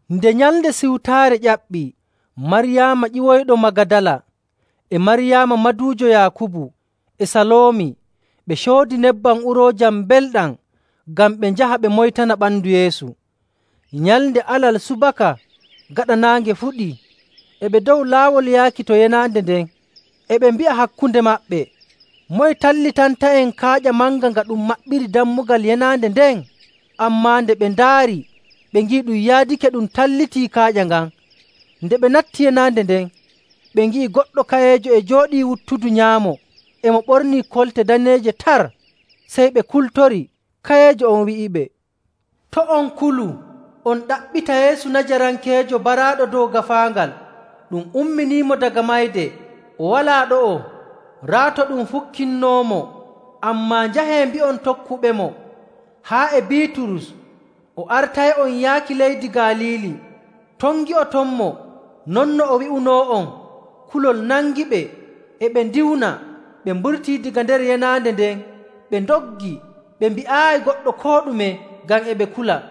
Nde Nyalnde Siwtaare ƴaɓɓii, Maryaama ƴiwoyɗo Magadala, e Maryaama maduujo Yaakubu, e Saloomi ɓe coodi nebbam uroojam mbelɗam ngam ɓe njaha ɓe moytana ɓandu Yeesu. Nyalnde Alal subaka gaɗa naange fuɗii, e ɓe dow laawol yaaki to yenaande nden, e ɓe mbi'a hakkunde maɓɓe, “Moye tallitanta'en kaaƴa manga nga ɗum maɓɓiri dammugal yenaande nden?” Ammaa nde ɓe ndaari ɓe ngi'i ɗum yaadake ɗum tallitii kaaƴa ngan. Nde ɓe natti yenaande nden, ɓe ngi'i goɗɗo kayeejo e jooɗii wuttudu nyaamo. E mo ɓornii kolte daneeje tar, sey ɓe kultori. Kayeejo on wi'iɓe, “To' on kulu. On ɗaɓɓita Yeesu Najarankeejo baraaɗo dow gaafaangal. Ɗum umminiimo daga mayde! O walaa ɗo'o. Raa to ɗum fukkinnoomo. Ammaa njahee mbi'on tokkuɓemo, haa e Biiturus, o artay'on yaaki leydi Galiili. Ton ngi'otonmo non no o wi'unoo'on.”. Kulol nangiɓe e ɓe ndiwna ɓe mburtii daga nder yenaande nden ɓe ndoggi. Ɓe mbi'aayi goɗɗo koo ɗume ngam e ɓe kula.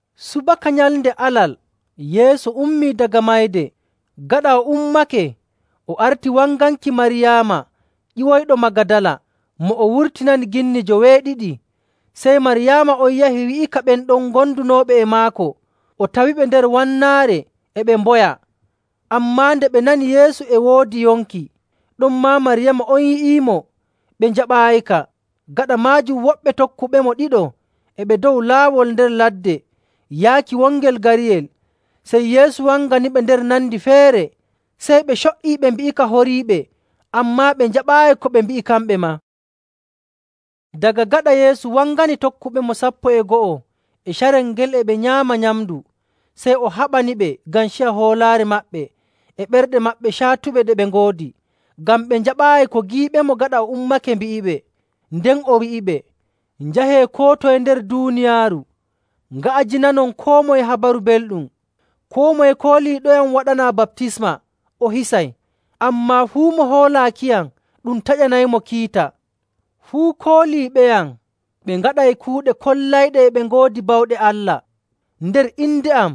[Subaka Nyalnde Alal Yeesu ummii daga mayde. Gaɗa o ummake o arti wanganki Maryaama ƴiwoyɗo Magadala mo o wurtinani ginni joweeɗiɗi. Sey Maryaama on yahi wi'ika ɓen ɗon gondunooɓe e maako, o tawiɓe nder wannaare e ɓe mboya. Ammaa nde ɓe nani Yeesu e woodi yonki, ɗonmaa Maryaama on yi'iimo, ɓe njaɓaayika. Gaɗa maajum woɓɓe tokkuɓemo ɗiɗo e ɓe dow laawol nder ladde yaaki wongel gariyel, sey Yeesu wanganiɓe nder nandi feere. Sey ɓe co''ii ɓe mbi'ika horiiɓe, ammaa ɓe njaɓaayi ko ɓe mbi'i kamɓe maa. Daga gaɗa Yeesu wangani tokkuɓemo sappo e go'o e carel ngel e ɓe nyaama nyamndu. Sey o haɓaniɓe ngam ciya hoolaare maɓɓe e ɓerɗe caatuɗe ɗe ɓe ngoodi, ngam ɓe njaɓaayi ko giiɓemo gaɗa o ummake mbi'iɓe. Nden o wi'iɓe, “Njahee koo toye nder duuniyaaru nga'ajinanon koo moye Habaru Belɗum.. Koo moye kooliiɗoyam waɗanaa baptisma o hisay, ammaa fuu mo hoolaakiyam ɗum taƴanaymo kiita. Fuu kooliiɓeyam ɓe ngaɗay kuuɗe kollayɗe e ɓe ngoodi bawɗe Allah. Nder inde am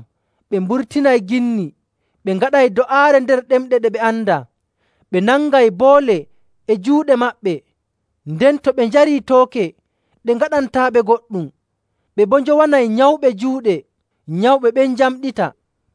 ɓe mburtinay ginni, ɓe ngaɗay do'aare nder ɗemɗe ɗe ɓe andaa. Ɓe nangay boole e juuɗe maɓɓe, nden to ɓe njarii tooke, ɗe ngaɗantaaɓe goɗɗum. Ɓe boo njowanay nyawɓe juuɗe, nyawɓe ɓen njamɗita.”